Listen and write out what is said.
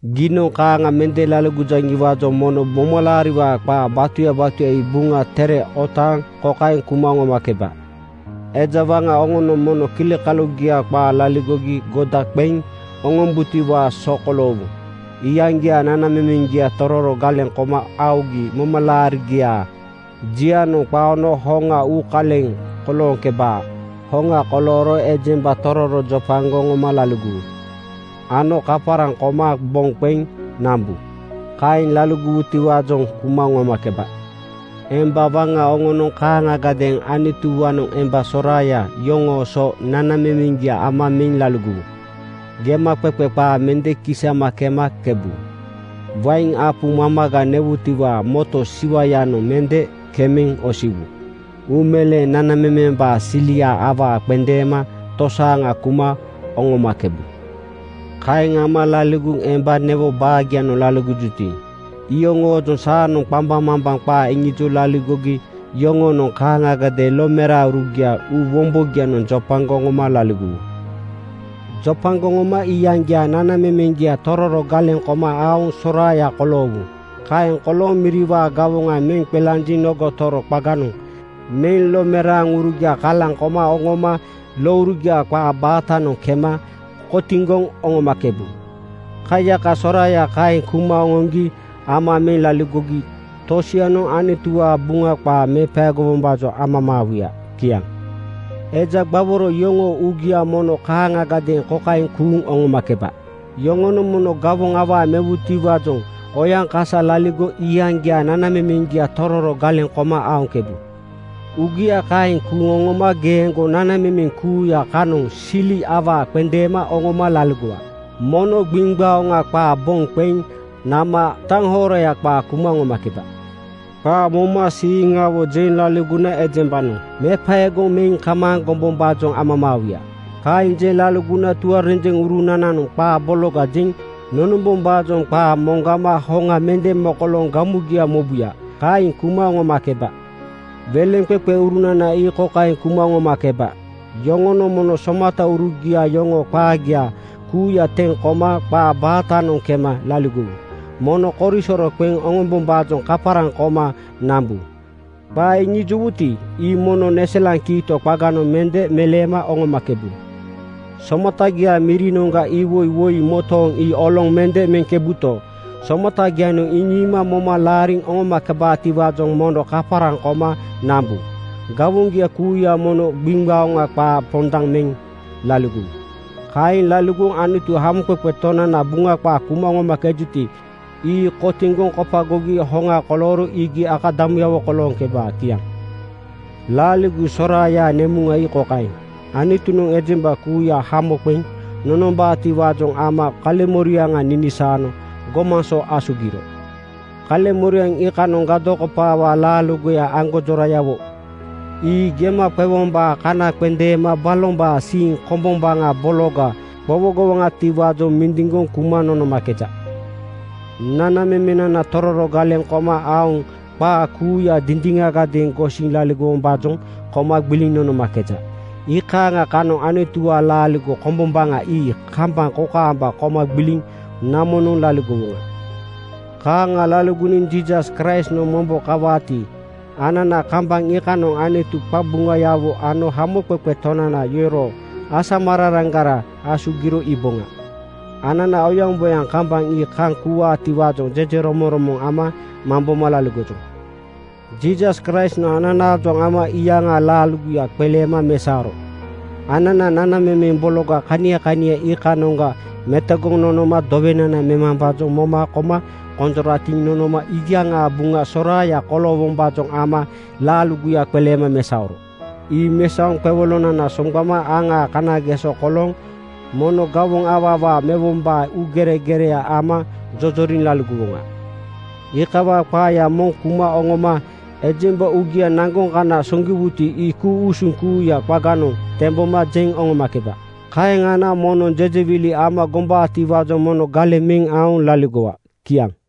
Giinoŋ kaaŋa mende laligojaŋiwaajoŋ mono momalaariwaa qaa batuya batuya ii Buŋa Tere otaaŋ kokaeŋ kuma oŋomakeba: Eja waŋa oŋonoŋ mono kilikalugia qaa laligogi goda qeŋ oŋomboŋatiwaa so koloowu. Iyaŋgiaa nanamemeŋgia tororo galeŋ koma aogi momalaarigiaa jianoŋ qaono hoŋa uukaleŋ kolooŋkebaa. Hoŋa kolooro ejemba tororo jopagoŋ oŋoma laligowu ano kaparaŋ koma boŋ qeŋ nambu. Kaeŋ laligowutiwaajoŋ kuma oŋomakeba. Emba waŋa oŋonoŋ kaaŋagadeeŋ Anutuwaanoŋ emba soraaya yoŋoo so nanamemeŋgia ama meŋ laligowu. Gemaqeqe qaa mende kisama kema kaŋkebu. Wain apu mamaga newutiwaa moto siwa-yanoŋ mende kemeŋ osiwu. Uumeleeŋ nanamemembaa silia awaa qendeema tosaaŋa kuma oŋomakebu. Kaeŋ ama laligoŋ emba newo baagianoŋ laligojuti, iyoŋoojoŋ saanoŋ qambaŋmambaŋ qaa iŋijoŋ laligogi yoŋonoŋ kaaŋagadeeŋ lomeraaŋurugia uu wombogianoŋ jopagoŋ oŋoma laligowu. Jopagoŋ oŋoma iyaŋgiaa nanamemeŋgia tororo galeŋ koma aoŋ soraaya koloowu. Kaeŋ kolooŋ miriwaa gawoŋa meŋ qelanjiŋ nogo toro qaganoŋ meŋ lomeraaŋurugia kalaŋ koma oŋoma lourugiaa qaa baatanoŋ kema kotiŋgoŋ oŋomakebu. Kaiyaka soraaya kaeŋ kuma oŋoŋgi ama meŋ laligogi tosianoŋ Anutuwaa Buŋa qaa mepaego-wombaajoŋ amamaawuya. Kiaŋ. Eja gbaworo yoŋoo uugia mono kaaŋagadeeŋ kokaeŋ kuuŋ oŋomakeba: Yoŋonoŋ mono gawoŋ awaa mewutiwaajoŋ oyaŋkasa laligoŋ iyaŋgiaa nanamemeŋgia tororo galeŋ koma aoŋkebu. Uugia kaeŋ kuuŋ oŋoma geeŋgo nanamemeŋ kuuya kanoŋ sili awaa qendeema oŋoma laligowa. Mono gbiŋgbaoŋa qaa boŋ qeŋ nama taŋhoraya qaa kuma oŋomakeba. Qaa momasiiŋawo jeŋ laligona ejembanoŋ mepaegoŋ meŋ kamaaŋ gombombaajoŋ amamaawuya. Kaeŋ jeŋ laligona tuarenjeŋurunananoŋ qaa bologa jeŋ nonombombaajoŋ qaa moŋgama hoŋa mende mokolooŋ gamugia mobuya. Kaeŋ kuma oŋomakeba. Weleŋqeqeurunana ii kokaeŋ kuma oŋomakeba: Yoŋonoŋ mono somataurugia yoŋoo qaagia kuuya teŋ koma qaa baatanoŋ kema laligowu. Mono korisoro qeŋ oŋombombaajoŋ kaparaŋ koma nambu. Qaa iŋijowuti, ii mono neselaŋ kiito qaganoŋ mende meleema oŋomakebu. Somatagiaa mirinoŋga iwoi woi motooŋ ii oloŋ mende meŋkebuto, somatagianoŋ iŋiima moma laariŋ oŋomakebaatiwaajoŋ mono kaparaŋ koma nambu. Gawoŋgia kuuya mono gbiŋgbaoŋa qaa pondaŋ meŋ laligowu. Kaeŋ laligoŋ Anutu Hamoqeqe Tonanaa Buŋa qaa kuma oŋomakejuti, ii kotiŋgoŋ kopagogi hoŋa kolooro iigi akadamuyawo kolooŋkebaa. Kiaŋ. Laaligo soraayaa nemuŋa ii kokaeŋ: Anutunoŋ ejemba kuuya hamo qeŋ nonombaatiwaajoŋ ama kaleŋmoriaŋa ninisaano gomaŋ so asugiro. Kaleŋmoriaŋ iikanoŋ gadokopawaa laaligoya aŋgonjorayawo ii gema qewombaa kana qendeema balombaa siiŋ kombombaŋa bologa qowogowoŋatiwaajoŋ mindiŋgoŋ kuma nonomakeja. Nanamemenana tororo galeŋ koma aoŋ qaa kuuya dindiŋagadeeŋ gosiŋ laligowombaajoŋ koma gbiliŋ nonomakeja. Iikaaŋa kanoŋ Anutuwaa laaligo kombombaŋa ii kambaŋ kokaamba koma gbiliŋ namonoŋ laligowoŋa. Kaaŋa laligoniŋ Jiisas Kraistnoŋ mombo kawaati, anana kambaŋ iikanoŋ Anutu qabuŋayawo ano Hamoqeqe Tonana yoroo asamararaŋgara asugiro iiboŋa. Anana oyaŋboyaŋ kambaŋa ii kaŋ kuuwaatiwaajoŋ jejeromoŋromoŋ ama mamboma laligojoŋ. Jiisas Kraistnoŋ ananaajoŋ ama iyaŋaa laaligoya qeleema mesaoro. Anana nanamemeŋ bologa kania kania iikanoŋa metogoŋ nonoma dowenana memambaajoŋ moma koma konjoratiŋ nonoma iyaŋaa buŋa soraaya koloowombaajoŋ ama laaligoya qeleema mesaoro. Ii mesaoŋ qewolonana soŋgbano aŋaa kanageso kolooŋ mono gawoŋ awaa awaa mewombaa uugeregere ama jojoriŋ laligowoŋa. Iikawaa qaaya mono kuma oŋoma ejemba uugia naŋgoŋ kana soŋgiwuti, ii ku-usuŋ kuuyaa qaganoŋ temboma jeŋ oŋomakeba. Kaeŋ ana moŋnoŋ jejewili ama gombabotiwaajoŋ mono galeŋ meŋ aoŋ laligowa. Kiaŋ.